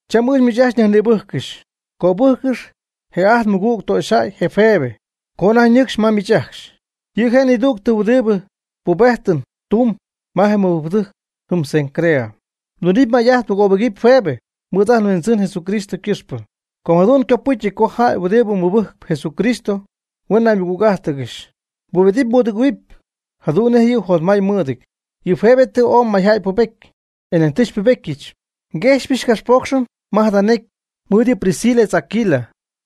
Cham ɨɨch miich ajcxy nyajnïbɨjccɨxy, cöbɨjccɨxy je ajt nmɨgüg töxyjäy je Febe co anajty ñɨcxy ma miich ajcxy. Yɨ' je' nidügtɨ huɨdibɨ pubejtɨn tumb ma je mɨbɨjcpɨdɨjc jɨm Cencrea. Mdunɨpy may'ajt mgöbɨgɨpy Febe mɨɨd ajt nHuindzɨn Jesús ycɨxpɨ. Com jadu'n ycopɨcyɨty co jäy huɨdibɨ mɨbɨjcp Jesucristo huen naymɨgüg'ájtɨgɨxy. Mbubedɨp mbudɨgɨ̈huɨp jadu'n nej yɨ' jotmay mɨɨdɨty. Yɨ Febe tɨ ooy mayjäy pubety, e nañ tɨ xypubetyɨch. Nguejxypyɨch capxpoocxɨn ma jada necy mɨɨd yɨ Priscila etz Aquila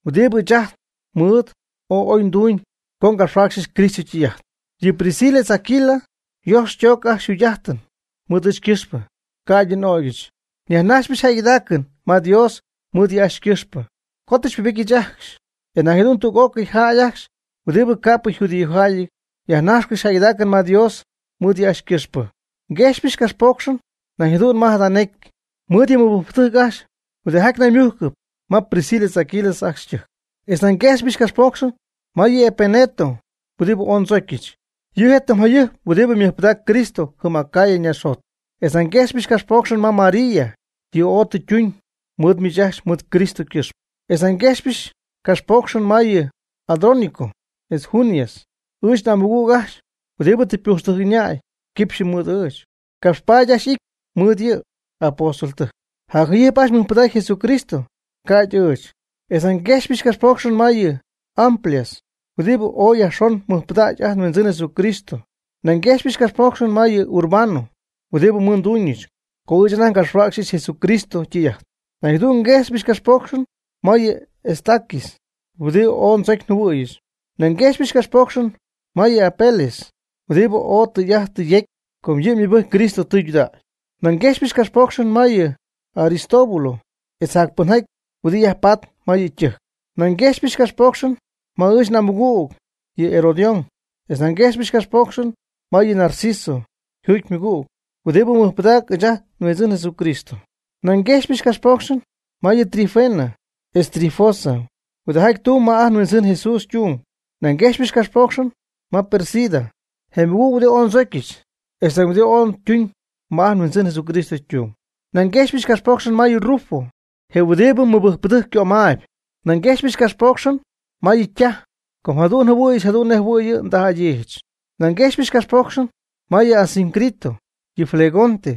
huɨdibɨ ɨɨch anajty mɨɨd ooy oy nduñ co ngapxhuäcxyɨch Cristo ytɨy'ajt. Yɨ Priscila etz Aquila yojx ytooc ajcxy yjugy'ajtɨn mɨɨd ɨɨch ycɨxpɨ, ca'ydɨ n'ögyɨch. Nyajnajxypɨch jäygɨdaacɨn ma Dios mɨɨd yɨ' ajcxy ycɨxpɨ, co tɨ xypubetyɨch ajcxy. E nañ jadu'n tüg'ócɨy jäy ajcxy huɨdibɨ ca'pɨ yjudíojäyɨty yajnajxcɨxy jäygɨdaacɨn ma Dios mɨɨd yɨ' ajcxy ycɨxpɨ. Nguejxypɨch capxpoocxɨn nañ jadu'n ma jada necy mɨɨd yɨ mɨbɨjcpɨdɨjc ajcxy huɨdijaty naymujccɨp ma Priscila etz Aquila ajcxy ytɨjc. Etz nañ nguejxpyɨch capxpoocxɨn ma yɨ Epeneto huɨdibɨ ooy ndzocyɨch. Yɨ' je' tɨm jayɨjp huɨdibɨ mɨjpɨdaac Cristo jɨm Acaya ñaaxjot. Etz nañ nguejxypɨch capxpoocxɨn ma María, yɨ' ooy tɨ ytuñ mɨɨd miich ajcxy mɨɨd Cristo ycɨxpɨ. Etz nañ nguejxpyɨch capxpoocxɨn ma yɨ Andrónico etz Junias. Ɨɨch n'amɨgüg ajcxy huɨdibɨ tɨ ypujxtɨjc ɨñäy quipxy mɨɨd ɨɨch. Capxpaady ajcxy y'ity mɨɨd yɨ apóstoltɨjc. Jacjayɨjp ajcxy mɨjpɨdacy Jesucristo ca'ydɨ ɨɨch. Etz nañ nguejxypɨch capxpoocxɨn ma yɨ Amplias, huɨdibɨ ooy yajxon mɨjpɨdägy ajt nHuindzɨn Jesucristo. Nañ nguejxypɨch capxpoocxɨn ma yɨ Urbano huɨdibɨ xymɨɨdtuñɨch co ɨɨch anajty ngapxhuäcxyɨch Jesucristo ytɨy'ajt. Nañ jadu'n nguejxypɨch capxpoocxɨn ma yɨ Estaquis huɨdibɨ oy ndzocy njɨhuɨ̈yɨch. Nañ nguejxpyɨch capxpoocxɨn ma yɨ Apeles, huɨdibɨ ooy tɨy'ajt tɨ yecy co yɨ' ymɨbɨjcpy Cristo tɨydudägy. Nañ nguejxypɨch capxpoocxɨn ma yɨ Aristóbulo etz jac pɨnjaty huɨdibɨ yajpatp ma yɨ' ytɨjc. Nañ nguejxypɨch capxpoocxɨn ma ɨɨch n'amɨgüg yɨ Herodión. Etz nañ nguejxypɨch capxpoocxɨn ma yɨ Narciso yjuugy ymɨgüg huɨdibɨ mɨjpɨdacp ɨɨch ajt nHuindzɨn Jesucristo. Nañ nguejxypɨch capxpoocxɨn ma yɨ Trifena etz Trifosa huɨdijaty tumb ma ajt nHuindzɨn Jesús ytung. Nañ nguejxypɨch capxpoocxɨn ma Pérsida, je mɨgüg huɨdi oy ndzocyɨch, etz nañ huɨdi ooy ytuñ ma ajt nHuindzɨn Jesucristo ytung. Nañ nguejxypɨch capxpoocxɨn ma yɨ Rufo, je huɨdibɨ yɨ mɨbɨjcpɨdɨjc ycömaayb. Nañ nguejxypɨch capxpoocxɨn ma yɨ' ytaj, com jadu'n njɨhuɨ̈yɨch jadu'n nej jɨhuɨ̈y yɨ' ndaj'adyiijɨch. Nañ nguejxpyɨch capxpoocxɨn ma yɨ Asíncrito, yɨ Flegonte,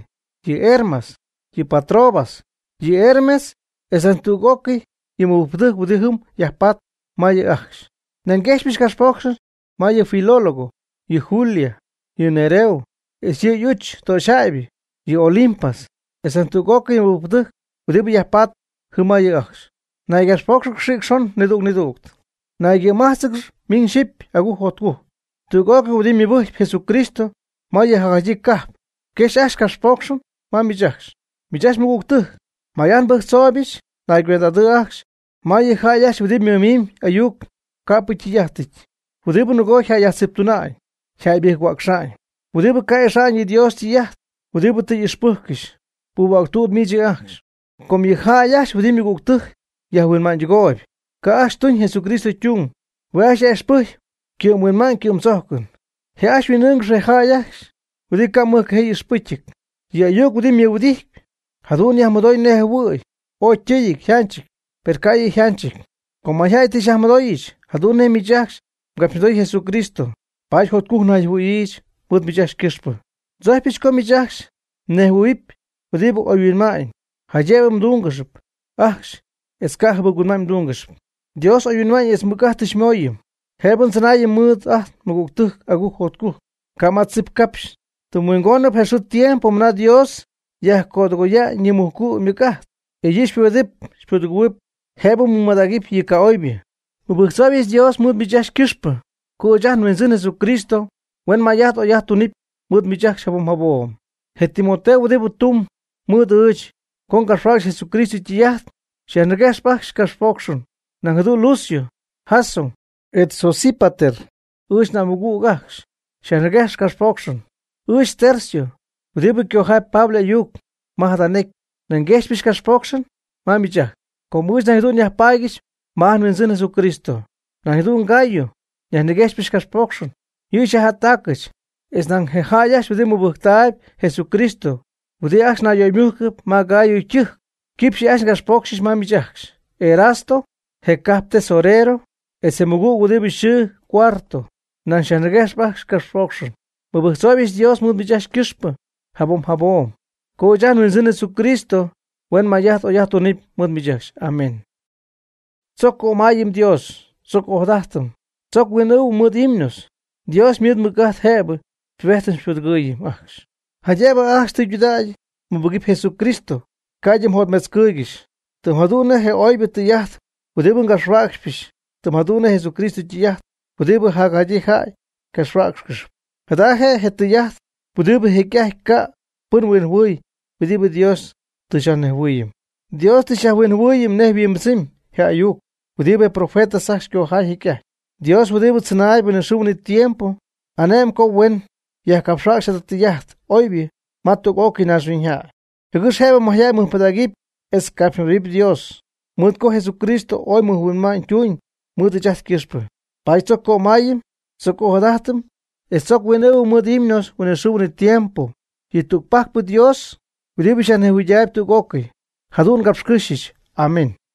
yɨ Hermas, yɨ Patrobas, yɨ Hermes etz ñan tüg'ócɨy yɨ mɨbɨjcpɨdɨjc huɨdi jɨm yajpatp ma yɨ' ajcxy. Nañ nguejxpyɨch capxpoocxɨn ma yɨ Filólogo, yɨ Julia, yɨ Nereo etz yɨ' y'uch töxyjäybɨ, yɨ Olimpas, etz nañ tüg'ócɨy yɨ mɨbɨjcpɨdɨjc huɨdibɨ yajpaatp jɨm ma yɨ' ajcxy. Naygapxpóocxɨgɨx xïc xon nidüg nidüg. Naygɨ̈májtzɨgɨx miñ yxipy agujc jotcujc. Tüg'ócɨy huɨdibɨ mɨbɨjcp Jesucristo ma yɨ jacjaydyii cajp, yquejxyp ajcxy capxpoocxɨn ma miich ajcxy. Miich ajcxy mɨgügtɨjc, may'ajt nbɨjctzooybɨch naygüend'adɨ' ajcxy ma yɨ jäy ajcxy huɨdibɨ mɨmiimb ayuc ca'pɨ ytɨy'ajtɨty, huɨdibɨ nɨgoob yjäyyajtziptuna'ñ yjäybɨjc-huäcxa'ñ, huɨdibɨ ca' ixa'ñ yɨ Dios ytɨy'ajt huɨdibɨ tɨ m'ixpɨjccɨxy. Puuhuäctüd miich yɨ' ajcxy. Com yɨ jäy ajcxy huɨdibɨ ymɨgügtɨjc yajhuinma'ñydɨgooyb, ca' ajcxy tuñ Jesucristo ytung. Hue' ajcxy yaj'ixpɨjcp huɨdi ycɨ'mhuinma'ñ ycɨ'mdzojcɨn. Je' ajcxy huin'ɨ́ɨnɨgɨxp je jäy ajcxy huɨdibɨ ca' mɨjcajee y'ixpɨcyɨty. Yɨ ayuc huɨdibɨ ymɨhuɨdijtyp, jadu'n yajmɨdoy nej jɨhuɨ̈y oy ytɨɨyɨty yjanchɨty, per ca' yɨ' yjanchɨty. Com mayjäy tɨ xyajmɨdooyɨch jadu'n nej miich ajcxy mgapxymɨdoy Jesucristo, paady jotcujc nayjɨhuɨ̈yiijɨch mɨɨd miich ajcxy ycɨxpɨ. Ndzojcypɨch co miich ajcxy mnejhuɨ̈huɨpy huɨdibɨ oyhuinma'ñ jaydëbɨ mdúngɨxɨpy ajcxy etz ca' jɨbɨc-huinma'ñ mdúngɨxɨpy. Dios oyhuinma'ñ etz mɨc'ajt tɨ xymooyɨm jëbɨ ndzɨnaayɨm mɨɨd ajt nmɨgügtɨjc agujc jotcujc, ca' ma tzip capxy. Tɨm huingon je xɨɨ je tiempo mɨna Dios yajcödɨgoya'ñ yɨ mujcu' ymɨc'ajt, e yɨ' xypubedɨp xypudɨgɨ̈huɨp jëbɨ mmɨmadägɨpy yɨ ca'oybɨ. Nmɨbɨjctzooybɨch Dios mɨɨd miich ajcxy ycɨxpɨ co ɨɨch ajt nHuindzɨn Jesucristo huen may'ajt oy'ajt tuñ mɨɨd miich ajcxy jabom jabom. Je Timoteo huɨdibɨ tumb mɨɨd ɨɨch co ngapxhuäcxɨch Jesucristo ytɨy'ajt xyajniguejxp ajcxy capxpoocxɨn. Nañ jadu'n Lucio, Jasón etz Sosípater ɨɨch n'amɨgüg ajcxy, xyajniguejxp capxpoocxɨn. Ɨɨch Tercio huɨdibɨ cojaayb Pablo y'ayuc ma jada necy, nañ nguejxypɨch capxpoocxɨn ma miich ajcxy, com ɨɨch nañ jadu'n nyajpaadyɨch ma ajt nHuindzɨn Jesucristo. Nañ jadu'n Gayo xyajniguejxp capxpoocxɨn, yɨ' xyajjättacɨch. E nañ je jäy ajcxy huɨdibɨ mɨjpɨdacp Jesucristo huɨdibɨ ajcxy nayyöymujcɨp ma Gayo ytɨjc yquejxyp ajcxy capxpoocxɨn ma miich ajcxy. Erasto je cajp ytesorero etz ajt nmɨgüg huɨdibɨ yxɨɨ Cuarto, nañ xyajniguejxp ajcxy capxpoocxɨn. Nmɨbɨjctzooybɨch Dios mɨɨd miich ajcxy ycɨxpɨ jabom jabom co ɨɨch ajt nHuindzɨn Jesucristo huen may'ajt oy'ajt tuñ ma miich ajcxy. Amén. Tzoc cömayɨm Dios, tzoc ojadajtɨm, tzoc huin'ɨɨhuim mɨɨd himnos. Dios mɨɨd ymɨc'ajt jëbɨ xypubedɨpy xypudɨgɨ̈huɨpy ajcxy, jaydëbɨ ajcxy tɨydudägy mmɨbɨgɨpy Jesucristo, ca'ydɨ mjotmetzcɨɨygɨxy. Tɨm jadu'n nej je oybɨ tɨy'ajt huɨdibɨ ngapxhuäcxpɨch tɨm jadu'n nej je Jesucristo ytɨy'ajt huɨdibɨ jacjadyii jäy ycapxhuäcxcɨxyp. Jada je tɨy'ajt huɨdibɨ jecy'ajty ca' pɨn huinjɨhuɨy huɨdibɨ Dios tɨ xyajnejhuɨɨyɨm. Dios tɨ xyajhuinjɨhuɨɨyɨm nej yhuimbɨdzɨmy je ayuc huɨdibɨ je profetas ajcxy ycojay jecy'ajty. Dios huɨdibɨ tzɨnaayb huinɨxɨɨ huinɨtiempo, ane'mb co huen yajcapxhuäcxy jada tɨy'ajt oybɨ ma tüg'ócɨy naaxhuiñyjäy, jɨgɨx jëbɨ mayjäy mɨjpɨdägɨp etz capxymɨdoohuɨpy Dios. Mɨɨd co Jesucristo ooy mɨjhuinma'ñ tuñ mɨɨd ɨɨch ajt ycɨxpɨ, paady tzoc cömayɨm, tzoc ojadajtɨm etz tzoc huin'ɨɨhuɨm mɨɨd himnos huinɨxɨɨ huinɨtiempo yɨ tügpajcpɨ Dios huɨdibɨ ñejhuɨydaayb tüg'ócɨy. Jadu'n ngapxcɨ́xyɨch. Amén.